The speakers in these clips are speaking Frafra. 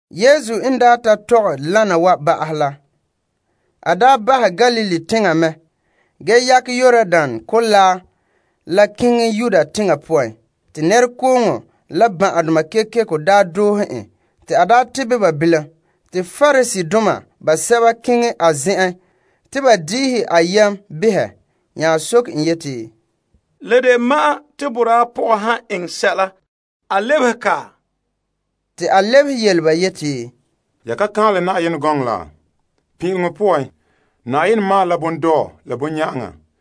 Yesu n daa ta tɔgɛ wana wa ba'ahɛ la, a bahɛ Galilee teŋa mɛ ge yakɛ Yordan Kolaa la keŋɛ Yudea teŋa poan. Nɛrekooŋɔ doohe en te a daa tebɛ ba bilam. Pariseedoma basɛba nya keŋɛ a zen'en te ba magahɛ en behɛ, soke en yeti, La de ma'an te boraa pɔga han eŋɛ sɛla a lebehe en? Te a lebehe yele ba yeti, Ya ka kaanlɛ te pin'ileŋɔ la Na'ayenɛ yuun naam boraa la pɔka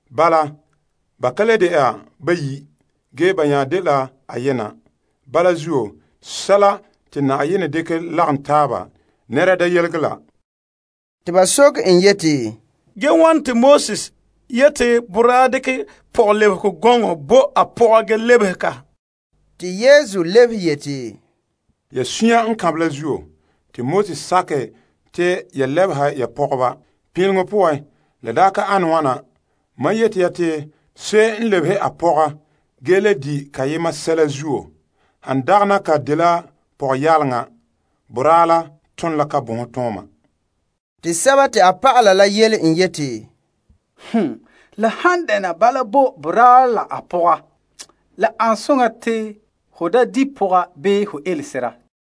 Bala, ba ka le de'a bayi', ge ba nya dela ayena. Bala zuo, sɛla te Na'ayenɛ n dekɛ lagom taaba, da bahɛ te nɛra yelege la. Te ba soke en yeti, Ge wane te Moses yeti boraa dekɛ pɔgɔlebehegɔ gɔŋɔ bo a pɔga ge lebehe en? Yesu lebehe yeti, Ya suunre n kanbɛ la zuo, te Moses sakɛ te ya lebeha ya pɔgɔba. Pin'ileŋɔ poan, la daa ka ane wana. Mam yeti ya te se'em n lebehe a pɔga ge le di' kayema sɛla zuo, han dagana ka dela pɔgɔyaalega, boraa la ton la yalomtooma. Te a dɔlɔba la yele en yeti, La han dɛna bala bo boraa la a pɔga, la ane soŋa te ho da di' pɔga bii ho ele sera.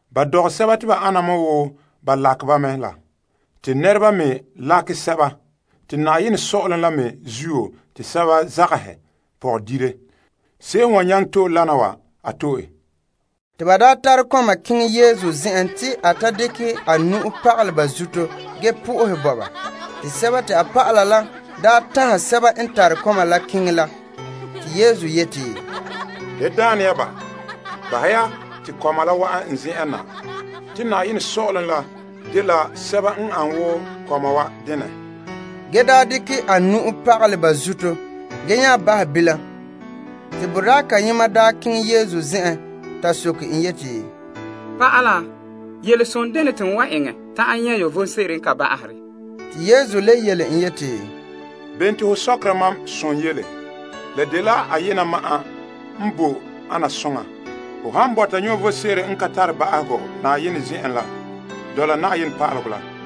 Ba dɔgɛ sɛba te ba ana wo ba lakɛ ba mɛ la, te nɛreba me lakɛ sɛba, te saazuo sɔ'ɔlom la me zuo te sɛba zagahɛ pɔgɔdire. Se'em n wan nyaŋɛ to'e wana wa, a to'e. Te ba nya daa tare kɔma keŋɛ Yesu zen'en te a ta dekɛ a nu'uhe pagalɛ ba zuto ge sohɛ Yenɛ bo ba. Te a dɔlɔba la daa tanhɛ sɛba n tare kɔma la keŋɛ la. Yesu yeti, Da daane ya ba. Bahɛ ya te kɔma la wa'an n zen'en na, te saazuo sɔ'ɔlom la dela sɛba n ane wo kɔma wa denɛ. En daa dekɛ a nu'uhe pagalɛ ba zuto, a nya bahɛ bilam. Boraa kayema daa keŋɛ Yesu zen'en ta soke en yeti, Pa'ala, yelesonɛ dene te n wan eŋɛ ta'an nyɛ' vom sebo n kan ba'ahe? Te Yesu yele en yeti, Bene te ho sɔkera mam som yele? La dela ayema ma'an n boe ana soŋa. Ho han bɔta vom sebo n ka tare ba'ahegɔ, dɔla a pa'alegɔ la.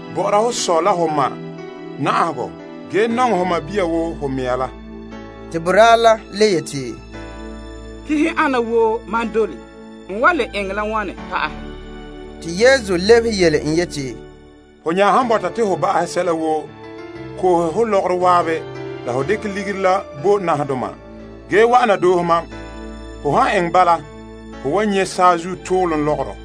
Bɔ'ɔra ho sɔ la ho ma na'ahegɔ ge nɔŋɛ ho sɔɔn woo ho mɛŋa la. Te boraa le yeti, Pa'alegɔ ana woo mam dole. N wan le eŋɛ la wane pa'ahɛ? Te Yesu lebehe yele en yeti, Ho nya han bɔta te ho ba'ahɛ sɛla woo, koohe ho lɔgɔrɔ zan'an la ho dekɛ ligiri la bo nahadoma ge wa'ana doohe mam. Ho han eŋɛ bala, ho wan nyɛ' saazuo toolom lɔgɔrɔ.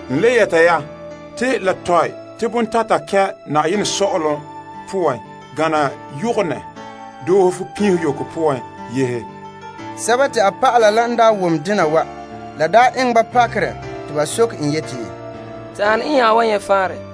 N le yɛta ya te la tɔe te bontata kɛn' Yenɛ sɔ'ɔlom poan gana yɔgɔnɛ doohe fupinho yoko poan yehe. Dɔlɔba la n daa wom dena wa, la eŋɛ ba pakerɛ te ba soke en yeti, Te ane n nya wan nyɛ' faanrɛ?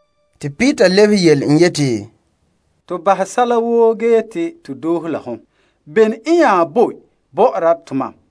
Peter lebehe yele en yeti, To bahɛ sɛla woo ge yeti to doohe la hom. Bene n nya boe bɔ'ɔra tomam?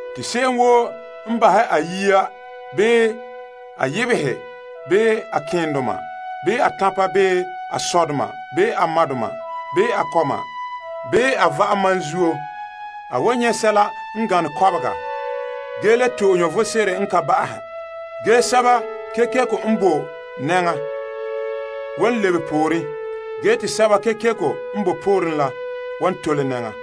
Te se'em woo n bahɛ a yiya bii a yebehe bii a keendoma bii a tanpa bii a sɔdoma bii a madoma bii a kɔma bii a va'am mam zuo, a wan nyɛ' sɛla n gane kɔbega ge le to'e vom sebo n kan ba'ahɛ. Ge sɛba kekeko n nan boe nɛŋa wan lebe pooren ge te sɛba kekeko n nan boe pooren wa wan tole nɛŋa.